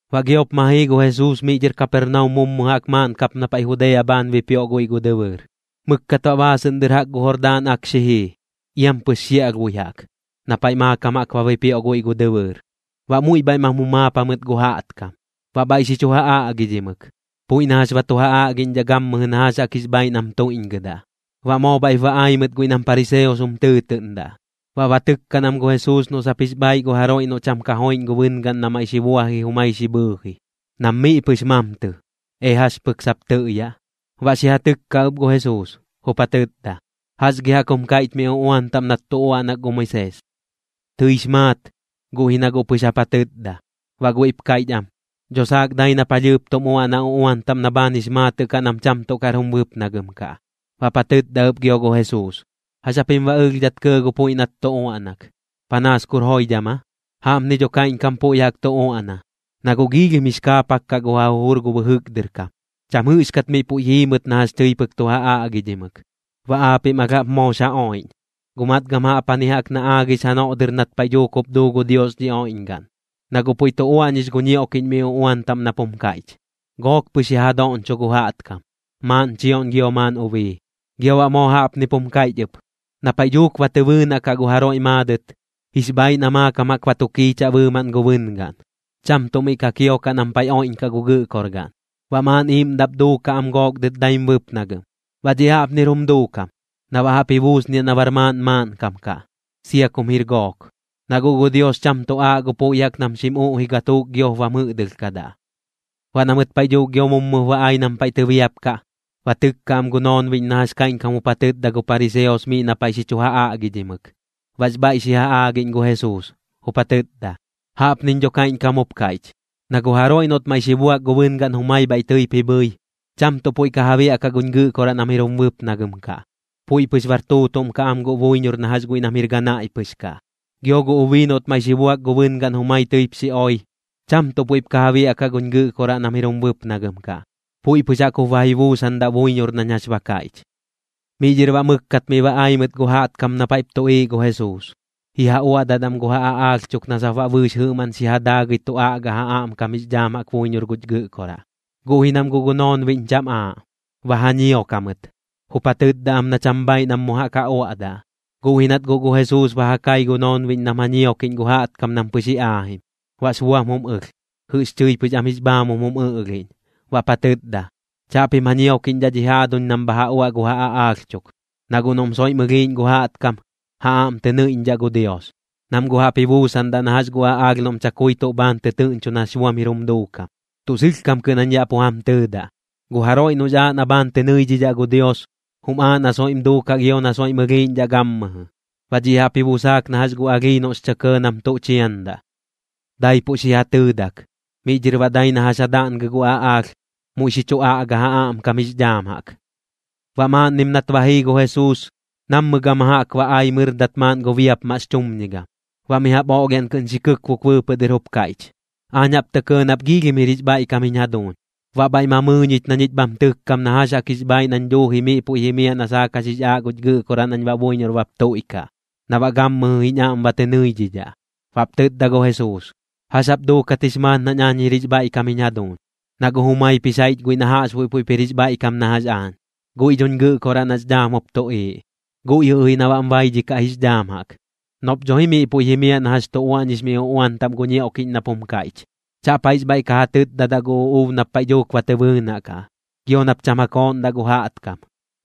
Baꞌ giop ma jii gu Jesuus miꞌ dhɨr Kapernaum mummu jaꞌk maaꞌn kap na paiꞌ Judea bhaan bipioꞌ guiꞌ gu dɨbɨɨr. Mɨkkat baꞌ baasɨꞌn dɨr jaꞌk gu Jordaan Ak xi jii, iampɨx xiaꞌlhbui jaꞌk, na paiꞌ maakam jaꞌk ba bipioꞌ guiꞌ gu dɨbɨɨr. Baꞌ muiꞌ bhaiꞌ mam jumaap jamɨt gu jaꞌtkam, baꞌ bhaiꞌ xi chu ja aꞌgidhimɨk, puiꞌ na jax ba tu ja aꞌgiꞌñdhaꞌ gammɨjɨ na jax jaꞌk jix bhaiꞌ nam tuiꞌñgɨdaꞌ. Baꞌ moo bhaiꞌp ba ai mɨt guiꞌ nam pariseos jum tɨɨtɨꞌndaꞌ, baꞌ ba tɨkkaꞌn am gu Jesuus noꞌ sap jix bhaaiꞌ gu jaroiꞌ noꞌ cham ka joiꞌñ gu bɨngaꞌn na maiꞌ xi buaji jumai xi bhɨɨji. Nam miꞌ pɨx mamtɨ, ee jax pɨk sap tɨꞌyaꞌ. Baꞌ xi ja tɨkka ɨp gu Jesuus, jup ja tɨtda: ―¿Jax gi jaꞌk jum kaiꞌch mi uꞌuan taꞌm nat tu uaꞌnak gu Moisees? Tɨix maat, guꞌ ji na guꞌ pɨx jap ja tɨtda. Baꞌ guiꞌp kaiꞌch am: ―Dho saak dai na palhɨɨp tum uaꞌnaꞌ uꞌuan taꞌm na bhaan jix maatɨꞌ kaꞌ nam cham tuꞌ kar jum bɨpnagɨm kaꞌ. Baꞌp ja tɨtda ɨp gio gu Jesuus: ―¿Jax japim baꞌ ɨlhdhat kɇɇ gu puiꞌ nat tu uaꞌnak? ¿Panaas kur joidham aa? Jaꞌpni dho kaiꞌñkam puiꞌ jaꞌk tu uaꞌna, na guꞌ giilhim jix kaapak kaꞌ gu ja jujur gu bɨjɨk dɨr kam, cham jɨꞌxkat miꞌ puiꞌ jii mɨt na jax tɨi pɨk tu ja aꞌgidhimɨk. Baꞌ aapiꞌm alh jaꞌp moox ja oiꞌñ. Guꞌ matgam jaꞌpjani jaꞌk na aagix janoꞌ dɨr nat paiꞌ dhuuk jup duu gu Dios dhi oiꞌñgaꞌn, na guꞌ puiꞌ tu uaꞌñix gu ñioꞌkiꞌñ mi uꞌuan taꞌm nap jum kaiꞌch: “Gook pɨx ya ja doꞌñcho gu jaꞌtkam, maaꞌn chioꞌñ gio maaꞌn ubii.” Gio baꞌ moo jaꞌpnip jum kaiꞌch ɨp: “Na paiꞌ dhuuk ba tɨ bɨɨnaꞌ kaꞌ gu jaroiꞌ maadɨt, jix bhaiꞌ na maakam jaꞌk ba tu kiichaꞌ bɨɨmaꞌn gu bɨngaꞌn, cham tuꞌ miꞌ ka kiokaꞌ nam paiꞌ oiꞌñkaꞌ gu gɨꞌkorgaꞌn. Baꞌ maaꞌn iiꞌmdaꞌp duukaꞌ am gook dɨt daim bɨpnagɨm.” Baꞌ dhiꞌ jaꞌpnir jum duukam, na baꞌ jaꞌp ji buusniaꞌ na bar maaꞌn maaꞌnkam kaꞌ, sia kum jir gook. Na guꞌ gu Dios cham tuꞌ aaꞌ gu puiꞌ jaꞌk nam xim uꞌji gatuuk giop bam jɨꞌdɨlhkadaꞌ. Baꞌ na mɨt paiꞌ dhuuk gio mummup ba ai nam paiꞌ tɨbiapkaꞌ, ba tɨkka am gu noonbiꞌñ na jax kaiꞌñkam jup ja tɨtda gu pariseos miꞌ na paiꞌ xi chu ja aꞌgidhimɨk. Baꞌx bhaiꞌ xi ja aagiꞌñ gu Jesuus, jup ja tɨtda: ―Jaꞌpniñ dho kaiꞌñkam jup kaiꞌch, na gu jaroiꞌ noꞌt maiꞌ xi buak gu bɨngaꞌn jumai bhaiꞌ tɨip ji bhɨi, cham tuꞌ puiꞌ ka ja biaꞌkaꞌ guñ Gɨꞌkoraꞌ nam jir jum bɨpnagɨm kaꞌ, puiꞌ pɨx bar tuutuꞌm kaꞌ am guꞌ buiñor na jax guiꞌ nam jir ganaiꞌ pɨx kaꞌ. Gio gu ubii noꞌt maiꞌ xi buak gu bɨngaꞌn jumai tɨip xi oi, cham tuꞌ puiꞌp ka ja biaꞌkaꞌ guñ Gɨꞌkoraꞌ nam jir jum bɨpnagɨm kaꞌ, puiꞌ pɨx jaꞌk jup ba ji buusandaꞌ buiñor nañ jax ba kaiꞌch. Miꞌ dhɨr baꞌ mɨkkat miꞌ ba ai mɨt gu jaꞌtkam na paiꞌp tuꞌiiꞌ gu Jesuus, ji ja uaꞌdat am gu ja aꞌaalh chuk na sap baꞌ bɨɨx jɨꞌmaꞌn xi ja daagɨi tu aꞌgaꞌ ja aꞌmkam jix dhaam jaꞌk buiñor guch Gɨꞌkoraꞌ. Guꞌ ji nam guꞌ gu noonbiꞌñ cham aaꞌ, ba ja ñiok jamɨt, jup ja tɨtda am na cham bhaiꞌ nam mu jaꞌk ja uaꞌdaꞌ. Guꞌ ji nat guꞌ gu Jesuus ba ja kai gu noonbiꞌñ nam ja ñiokiꞌñ gu jaꞌtkam nam pɨx ji aajim, baꞌx buam jum ɨlh, jɨꞌx chɨi pɨx am jix bhaamum jum ɨꞌlhiꞌñ, baꞌp ja tɨtda: ―Chaꞌpim ja ñiokiꞌñdhaꞌ dhi jaaduñ nam bha ja uaꞌ gu ja aꞌaalh chuk, na guꞌ noꞌm soiꞌm ɨlhiiꞌñ gu jaꞌtkam, ja aꞌm tɨ nɨiꞌñdhaꞌ gu Dios. Nam guꞌ jaꞌp ji buusandaꞌ na jax gu aꞌaalh noꞌm chakui tuꞌ bhaan tɨtɨɨꞌñchu nax buam jir jum duukam. Tuꞌ sɨlhkam kɨꞌn jañ yaꞌ pu jam tɨɨdaꞌ, gu jaroiꞌ noꞌx aaꞌ na bhaan tɨ nɨidhidhaꞌ gu Dios, jum aaꞌ na soiꞌm duukaꞌ gio na soiꞌm ɨlhiiꞌñdhaꞌ gammɨjɨ. Baꞌ dhiꞌ jaꞌp ji busaak na jax gu alhii noꞌx chɨ kɇɇ nam tuꞌ chiandaꞌ. Daipuꞌ xi ja tɨɨdak, miꞌ dhɨr baꞌ dai na jax ja daꞌngɨ gu aꞌaalh, muiꞌ xi chu aꞌga ja aꞌmkam jix dhaam jaꞌk. Baꞌ maaꞌnnim nat ba jii gu Jesuus, nammɨ gama jaꞌk ba ai mɨrdat maaꞌn gu biapmaꞌx chumñigam, baꞌ mi jaꞌp oꞌlhiaꞌn kɨꞌn xi kɨkbuk bɨɨpɨꞌ dɨr jup kaiꞌch: ―Aañ jaꞌp tɇ kɇɇ nap joidham jir jix bhaiꞌkam jiñ jaduuñ. Baꞌ bhaiꞌ ma mɨɨ ñich na ñich bham tɨkkam na jax jaꞌk jix bhaiꞌ nañ duuji miꞌ puiꞌ jimiaꞌ na saak jax jix aaꞌ guch Gɨꞌkoraꞌ nañ baꞌ buiñor bap tuiꞌkaꞌ, na baꞌ gammɨjɨ jiñ aꞌm ba tɨ nɨiꞌñdhaꞌ. Baꞌp tɨtda gu Jesuus: ―¿Jax jap duukat jix maat nañ jir jix bhaiꞌkam jiñ jaduuñ? Na guꞌ jumaip jix jaiꞌch guiꞌ na jaꞌxbuiꞌ puiꞌp jir jix bhaiꞌkam na jax aañ, guiꞌ dhoñ Gɨꞌkoraꞌ nax dhaam jup tuꞌiiꞌ. Guiꞌ jɨꞌ ji na baꞌm baidhikaꞌ jix dhaam jaꞌk, noꞌp dho ji miꞌ puiꞌ jimiaꞌ na jax tu uaꞌñix mi uꞌuan taꞌm gu ñioꞌkiꞌñ nap jum kaiꞌch: “Chaꞌp jaiꞌx bhaiꞌ ka ja tɨtdadaꞌ gu uꞌuub nap paiꞌ dhuuk ba tɨ bɨɨnaꞌ kaꞌ. Gio nap cham ja kooꞌndaꞌ gu jaꞌtkam.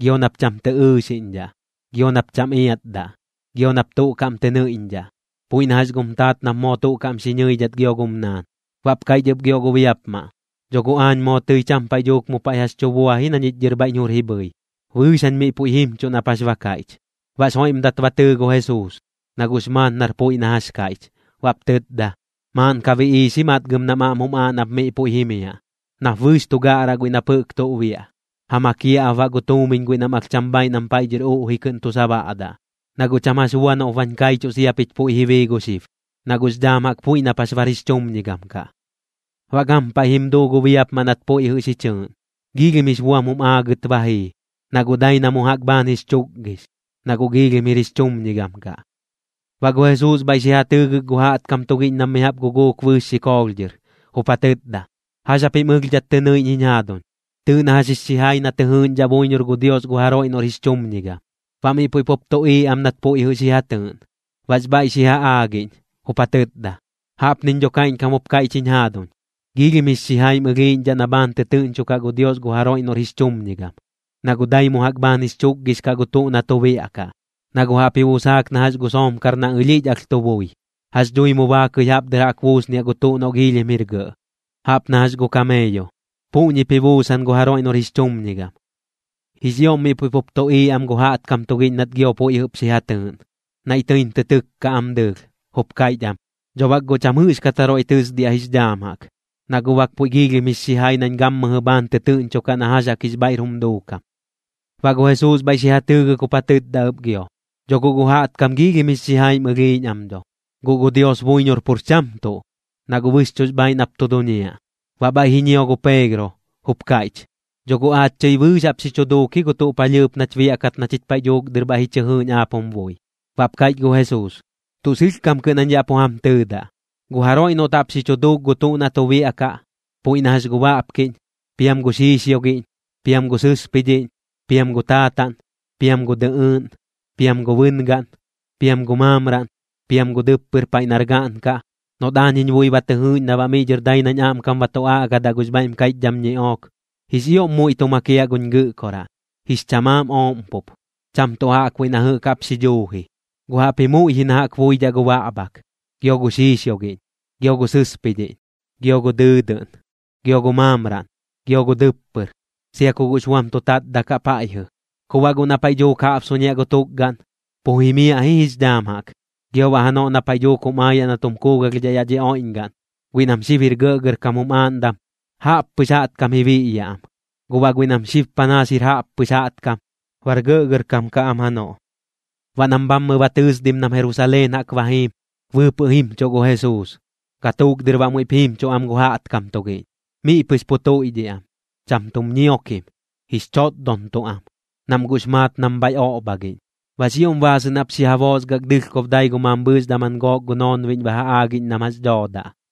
Gio nap cham tɨ ɨɨxiꞌñdhaꞌ. Gio nap cham iatdaꞌ. Gio nap tuꞌ kaꞌm tɨ nɨiꞌñdhaꞌ, puiꞌ na jax gum taat nap moo tuꞌ kaꞌm xi ñɨidhat gio gum naan.” Baꞌp kaiꞌch ɨp gio gu biapmaꞌ: ―Dho guꞌ aañ moo tɨi cham paiꞌ dhuuk mu paiꞌ jax tu bua ji na ñich dhɨr bhaiꞌñ jur ji bhɨi. Bɨɨx jañ miꞌ puiꞌ jimchuꞌ nap jax ba kaiꞌch. Baꞌx joiꞌmdat ba tɨɨ gu Jesuus, na guꞌx maat nar puiꞌ na jax kaiꞌch. Baꞌp tɨtda: ―Maaꞌn ka biꞌiix ji matgam nam aꞌm jum aaꞌ nap miꞌ puiꞌ jimiaꞌ, nap bɨɨx tu gaꞌraꞌ guiꞌ nap jɨꞌk tuꞌ biaꞌ, ja makiaꞌ ap baꞌ gu tuumiñ guiꞌ nam alh cham bhaiꞌ nam paiꞌ dhɨr uꞌji tuꞌ kɨꞌn tu sabaꞌdaꞌ. Na guꞌ cham jax bua noꞌp bañ kaichuꞌ sia pich puiꞌ ji bii gu xib, na guꞌx dhaam jaꞌk puiꞌ nap jax bar jix chumñigam kaꞌ. Baꞌ gampaiꞌ jim duu gu biapmaꞌ nat puiꞌ jɨꞌ xi chɨɨꞌn. Giilhim jix buam jum aagɨt ba jii, na guꞌ dai mu jaꞌk bhaan jix chukgix, na guꞌ giilhim jir jix chumñigam kaꞌ. Baꞌ gu Jesuus bhaiꞌ xi ja tɨɨgɨk gu jaꞌtkam tugiꞌñ nam mi jaꞌp guguuk bɨɨx xikoolh dhɨr, jup ja tɨtda: ―¿Jax japim ɨlhdhat tɨ nɨiꞌñ jiñ jaaduñ? Tɨɨꞌ na jax jix xijai na tɨ jɨɨꞌñdhaꞌ buiñor gu Dios gu jaroiꞌ noꞌr jix chumñigam. Baꞌ miꞌ puiꞌ pup tuꞌiiꞌ am nat puiꞌ jɨꞌ xi ja tɨɨꞌn. Baꞌx bhaiꞌ xi ja aagiꞌñ, jup ja tɨtda: ―Jaꞌpniñ dho kaiꞌñkam jup kaiꞌch jiñ jaaduñ. Giilhim jix xijaim ɨlhiiꞌñdhaꞌ na bhaan tɨtɨɨꞌñchukaꞌ gu Dios gu jaroiꞌ noꞌr jix chumñigam, na guꞌ dai mu jaꞌk bhaan jix chukgix kaꞌ gu tuꞌ na tu biaꞌkaꞌ. Na guꞌ jaꞌp ji busaak na jax gu soomkar na alhiꞌch alh tu bui. ¿Jax dhui mu baakɨi jaꞌp dɨr jaꞌk ji buusniaꞌ gu tuꞌ noꞌ giilhim jir gɇꞌ, jaꞌp na jax gu kameeyo? Puꞌñip ji buusan gu jaroiꞌ noꞌr jix chumñigam. Jix ioꞌm miꞌ puiꞌ pup tuꞌiiꞌ am gu jaꞌtkam tugiꞌñ nat gio puiꞌ jɨꞌp xi ja tɨɨꞌn. Naiꞌ tɨim tɨ tɨkka am dɨɨlh, jup kaiꞌch am: ―Dho bak guꞌ cham jɨꞌxkat jaroiꞌ tɨsdiaꞌ jix dhaam jaꞌk, na guꞌ bak puiꞌ giilhim jix xijai nañ gammɨjɨ bhaan tɨtɨɨꞌñchokaꞌ na jax jaꞌk jix bhaiꞌr jum duukam. Baꞌ gu Jesuus bhaiꞌ xi ja tɨɨgɨk jup ja tɨtda ɨp gio: ―Dho guꞌ gu jaꞌtkam giilhim jix xijaim ɨlhiiꞌñ am dho. Guꞌ gu Dios buiñor pur cham tuꞌ, na guꞌ bɨxchuꞌx bhaaiꞌ nap tu duñiaꞌ. Baꞌ bhaiꞌ ji ñio gu Peegro, jup kaiꞌch: ―Dho guꞌ aach chɨi bɨɨx jaꞌp xi dhuuk ji gu tuꞌ palhɨɨp nach biaꞌkat na chich paiꞌ dhuuk dɨr bhaiꞌ ji chɨ jɨɨꞌñ aap jum bui. Baꞌp kaiꞌch gu Jesuus: ―Tuꞌ sɨlhkam kɨꞌn jañ yaꞌ pu jam tɨɨdaꞌ, gu jaroiꞌ noꞌt jaꞌp xi dhuuk gu tuꞌ na tu biaꞌkaꞌ, puiꞌ na jax gu baꞌpkiꞌñ, piam gu xiixioꞌgiꞌñ, piam gu sɨspidhiꞌñ, piam gu taataꞌn, piam gu dɨꞌɨɨꞌn, piam gu bɨngaꞌn, piam gu maamraꞌn, piam gu dɨppɨr paiꞌ nar gaꞌn kaꞌ, noꞌt aañ jiñ bui ba tɨ jɨɨꞌñ na baꞌ miꞌ dhɨr dai nañ aꞌmkam ba tu aꞌgadaꞌ gux bhaiꞌm kaiꞌchdham ñiꞌook, jix ioꞌm muiꞌ tu makiaꞌ guñ Gɨꞌkoraꞌ, jix chamaam ooꞌm pup. Cham tuꞌ jaꞌkbuiꞌ na jɨꞌk jaꞌp xi dhuu ji, guꞌ jaꞌpji muiꞌ ji na jaꞌk iabuidhaꞌ gu baꞌbhak, gio gu xiixioꞌgiꞌñ, gio gu sɨspidhiꞌñ, gio gu dɨɨdɨꞌn, gio gu maamraꞌn, gio gu dɨppɨr, sia ku guꞌx buam tu tatdakaꞌ paiꞌjɨ. Ku baꞌ guꞌ na paiꞌ dhuuk jaꞌbsuñiaꞌ gu tukgaꞌn, pu jimiaꞌ ji jix dhaam jaꞌk. Gio baꞌ janoꞌ na paiꞌ dhuuk jum aayaꞌ na tum kuugalhdhaꞌ yaꞌ dhi oiꞌñgaꞌn, guiꞌ nam xib jir gɇꞌgɇrkam jum aaꞌndam, jaꞌppɨx jaꞌtkam ji biꞌyaꞌ am, guꞌ baꞌ guiꞌ nam xib panaas jir jaꞌppɨx jaꞌtkam, bar gɇꞌgɇrkam kaꞌ am janoꞌ. Baꞌ nam bhammɨ ba tɨɨsdim nam Jerusaleen jaꞌk ba jiim, bɨɨpɨꞌ jimchuꞌ gu Jesuus, gatuuk dɨr baꞌ muiꞌp jiimchuꞌ am gu jaꞌtkam tugiꞌñ. Miꞌ pɨx pu tuiꞌdhiꞌ am, cham tum ñiokim, jix chotdontuꞌ am, nam guꞌx maat nam bhaiꞌ oꞌbhagiꞌñ. Baꞌx ioꞌm baasɨꞌn jaꞌp xi ja boosgak dɨlhkob dai gu mambhɨɨx daman gook gu noonbiꞌñ ba ja aagiꞌñ nam jax dhoodaꞌ,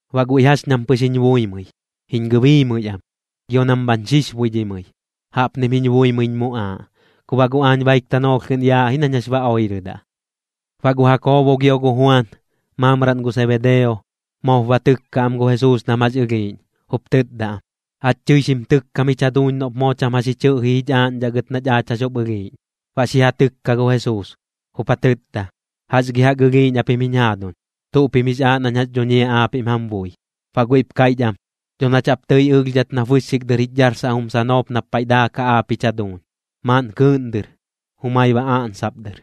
Baꞌ guiꞌ jax ñam pɨx jiñ buimɨi, jiñ gɨbiimɨi am, gio nam bhañ xixbuidhimɨi. Jaꞌpnim jiñ buimɨiñ muꞌaaꞌ, ku baꞌ guꞌ aañ baik tanoolh kɨꞌn yaaꞌ ji nañ jax ba oirɨdaꞌ. Baꞌ gu Jakoobo gio gu Juan, maamraꞌn gu Sebedeo, moop ba tɨkka am gu Jesuus nam jax ɨlhiiꞌñ, jup tɨtda am: ―Aach tɨi xim tɨkkam jich jaduuñ noꞌp moo cham jax tɨꞌji jich aaꞌñdhaꞌ gɨt nach aach jax jup ɨlhiiꞌñ. Baꞌ xi ja tɨkka gu Jesuus, jup ja tɨtda: ―¿Jax gi jaꞌk ɨlhiiꞌñ japim jiñ jaaduñ? ¿Tuꞌ pim jix aaꞌ nañ jax dhuñiaꞌ aapiꞌm jam bui? Baꞌ guiꞌp kaiꞌch am: ―Dho nach jaꞌp tɨi ɨlhdhat nap bɨxxik dɨr jich dharsaꞌ jum sanoop nap paiꞌ daakaꞌ aap jich jaduuñ, maaꞌn kɨɨꞌn dɨr, jumai baꞌ oꞌnsop dɨr,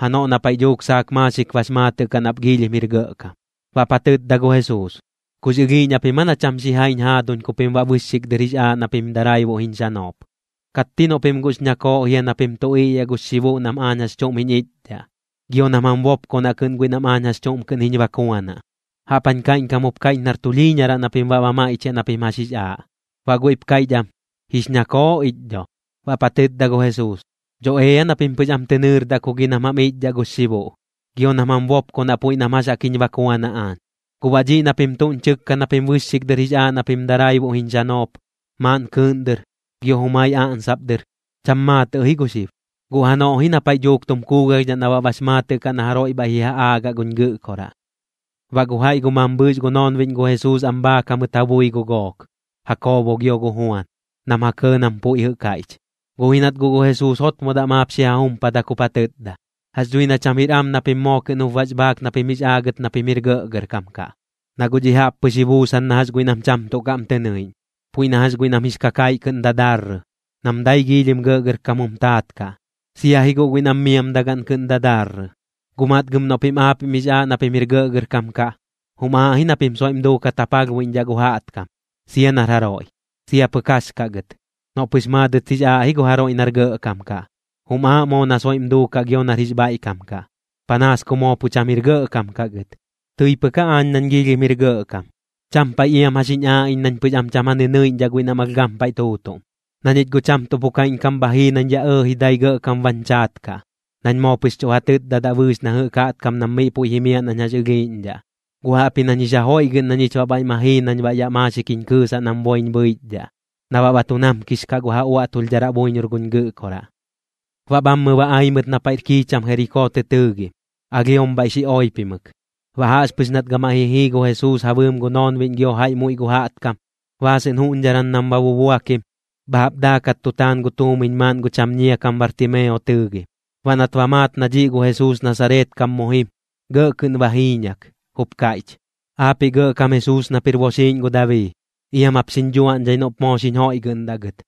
janoꞌ na paiꞌ dhuuk saak maaxik bax maatɨꞌ kaꞌ nap jix ioꞌm jir gɇꞌkam. Baꞌp ja tɨtda gu Jesuus: ―¿Kux ɨlhiiꞌñ japim aa na cham xijaiñ jaaduñ ku pim baꞌ bɨxxik dɨr jix aaꞌ na pim daraibuꞌ jiñ xanop? ¿Katti noꞌ pim guꞌx ñakooꞌ jia na pim tu iꞌyaꞌ gux xibuꞌ nam aañ jax chuꞌm jiñ ichdhaꞌ, gio nam jam bopkonaꞌ kɨꞌn guiꞌ nam aañ jax chuꞌm kɨꞌn jiñ bakuanaꞌ? Jaꞌp jañ kaiꞌñkam jup kaiꞌch nar tulhiiñaraꞌ na pim baꞌ ba maiꞌchiaꞌ na pim jax jix aaꞌ. Baꞌ guiꞌp kaiꞌch am: ―Jix ñakooꞌ ich dho. Baꞌp ja tɨtda gu Jesuus: ―Dho ea na pim pɨx am tɨ nɨrdaꞌ ku gi nam jam ichdhaꞌ gux xibuꞌ, gio nam jam bopkonaꞌ puiꞌ nam jax jaꞌk jiñ bakuanaꞌ aañ. Guꞌ baꞌ dhiꞌ na pim tuꞌñ chɨkka na pim bɨxxik dɨr jix aaꞌ na pim daraibuꞌ jiñ xanop, maaꞌn kɨɨꞌn dɨr, gio jumai oꞌnsop dɨr, cham maatɨꞌ ji gu xib. Guꞌ janoꞌ ji na paiꞌ dhuuk tum kuugalhdhaꞌ na baꞌ bax maatɨꞌ kaꞌ na jaroiꞌ bhaiꞌ ji ja aagaꞌ guñ Gɨꞌkoraꞌ. Baꞌ gu jaiꞌ gu mambhɨɨx gu noonbiꞌñ gu Jesuus am bhaak jamɨt ja bui gu gook, Jakoobo gio gu Juan, nam ja kɇɇ nam puiꞌ jɨꞌ kaiꞌch. Guꞌ ji nat guꞌ gu Jesuus jotmodaꞌ maap xi ja jumpadak jup ja tɨtda: ―Jax dhui na cham jir am na pim moo kɨꞌn jup bax bhaak na pim jix aagɨt na pim jir gɇꞌgɇrkam kaꞌ. Na guꞌ dhiꞌ jaꞌp pɨx ba ji buusan na jax guiꞌ nam cham tuꞌ kaꞌm tɨ nɨiꞌñ, puiꞌ na jax guiꞌ nam jix kakaiꞌ kɨꞌn dadarrɨ, nam dai giilhim gɇꞌgɇrkam jum taat kaꞌ, sia ji guꞌ guiꞌ nam miamdagaꞌn kɨꞌn dadarrɨ. Guꞌ matgam noꞌ pim aapiꞌm jix aaꞌ na pim jir gɇꞌgɇrkam kaꞌ, jum aaꞌ ji na pim soiꞌm duukat ja palhbuiꞌñdhaꞌ gu jaꞌtkam, sia nar jaroiꞌ, sia pɨk jax kaꞌ gɨt. Noꞌ pɨx maadɨt jix aaꞌ ji gu jaroiꞌ nar gɇꞌkam kaꞌ, jum aaꞌ moo na soiꞌm duukaꞌ gio nar jix bhaiꞌkam kaꞌ, panaas ku moo pu cham jir gɇꞌkam kaꞌ gɨt. Tɨi pɨk aañ nañ jix ioꞌm jir gɇꞌkam, cham paiꞌ iam jax jiñ aaꞌ iñ nañ pɨx am cham ja nɨnɨiꞌñdhaꞌ guiꞌ nam alh gampaiꞌ tuutuꞌm. Na ñich guꞌ cham tuꞌ pu kaiꞌñkam bha jii nañ yaꞌ ɇɇji dai gɇꞌkam bañ chaat kaꞌ, nañ moo pɨx chuꞌ ja tɨtdadaꞌ bɨɨx na jɨꞌk jaꞌtkam nam miꞌ puiꞌ jimiaꞌ nañ jax ɨlhiiꞌñdhaꞌ. Guꞌ jaꞌpji nañ jix ja joiꞌgɨꞌn na ñich baꞌ bhaiꞌ ma jii nañ baꞌ yaꞌ maaxik jiñ kɨɨsaꞌ nam boiñ bhɨichdhaꞌ, na baꞌ tu namkix kaꞌ gu ja uaꞌtulhdharaꞌ buiñor guñ Gɨꞌkoraꞌ. Baꞌ bhammɨ ba ai mɨt na paiꞌr kikcham Jerikoo tɨ tɨɨgim, alhiom bhaiꞌ xi oipimɨk. Baꞌ jaꞌxpɨx nat gamaiꞌ ji jii gu Jesuus ja bɨɨm gu noonbiꞌñ gio jaiꞌ muiꞌ gu jaꞌtkam, baasɨꞌn juꞌñdharan nam ba bubuakim, bha jaꞌp daakat tu taan gu tuumiñ maaꞌn gu cham ñia kam Bartimeo tɨɨgim. Baꞌ nat ba maat na dhiꞌ gu Jesuus Nasareet kam mu jim, gɇꞌ kɨꞌn ba jiiñak, jup kaiꞌch: ―Aapiꞌ Gɇꞌkam Jesuus nap jir boxiiꞌñ gu Dabii, iam jap xiñ dhuaꞌñdhai noꞌp moo xiñ joiꞌgɨꞌndaꞌ gɨt.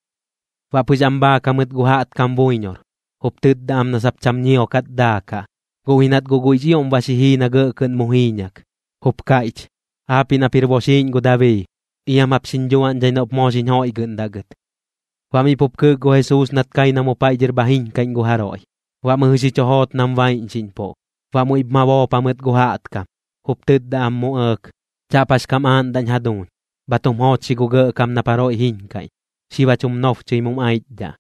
Baꞌ pɨx am bhaak jamɨt gu jaꞌtkam buiñor, jup tɨtda am na sap cham ñiokat daakaꞌ. Guꞌ ji nat guꞌ guiꞌx ioꞌm ba xi jii na gɇꞌ kɨꞌn mu jiiñak, jup kaiꞌch: ―Aapiꞌ nap jir boxiiꞌñ gu Dabii, iam jap xiñ dhuaꞌñdhai noꞌp moo xiñ joiꞌgɨꞌndaꞌ gɨt. Baꞌ miꞌ pup kɨɨk gu Jesuus nat kai na mu paiꞌ dhɨr bha jiiñkaiꞌñ gu jaroiꞌ, baꞌ mɨjɨ xi chu joot nam baiꞌñxiꞌñpuꞌ. Baꞌ muiꞌp ma boop jamɨt gu jaꞌtkam, jup tɨtda am mu ɇɇk: ―Chaꞌp jax kam aaꞌndaꞌñ jaduuñ. Bha tum joochxi gu Gɇꞌkam nap jaroiꞌ jiiñkaiꞌñ. Xib jach jum nobchɨi mum aichdhaꞌ.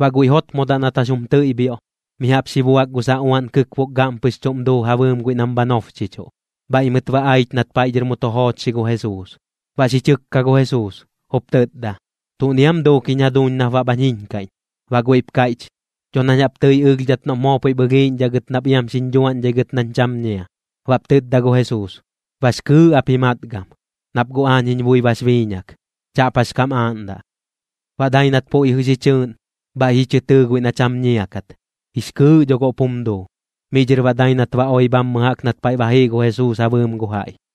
Baꞌ guiꞌ jotmodaꞌ nat jax jum tɨiꞌbhioꞌ, mi jaꞌp xi buak gu saꞌuaꞌn kɨkbuk gaꞌm pɨx chuꞌm duu ja bɨɨm guiꞌ nam bha nobchichuꞌ. Bhaiꞌ mɨt ba aich nat paiꞌ dhɨr mu tu joochxi gu Jesuus, baꞌ xi chɨkka gu Jesuus, jup tɨtda: ―¿Tuꞌni aam duuk jiñ jaduuñ nap baꞌ bhañ jiiñkaiꞌñ? Baꞌ guiꞌp kaiꞌch: ―Dho nañ jaꞌp tɨi ɨlhdhat noꞌp moo puiꞌp ɨlhiiꞌñdhaꞌ gɨt nap iam xiñ dhuaꞌñdhai gɨt nañ cham ñia. Baꞌp tɨtda gu Jesuus: ―Bax kɨɨꞌ ap ji matgam, nap guꞌ aañ jiñ bui bax biiñak. Chaꞌp jax kam aaꞌndaꞌ. Baꞌ dai nat puiꞌ jɨꞌ xi chɨɨꞌn, bhaiꞌ ji chɨ tɨɨ guiꞌ na cham ñia kat, jix kɨɨꞌ dho guꞌp jum duu. Miꞌ dhɨr baꞌ dai nat ba oi bhammɨ jaꞌk nat paiꞌ ba jii gu Jesuus ja bɨɨm gu jaiꞌ.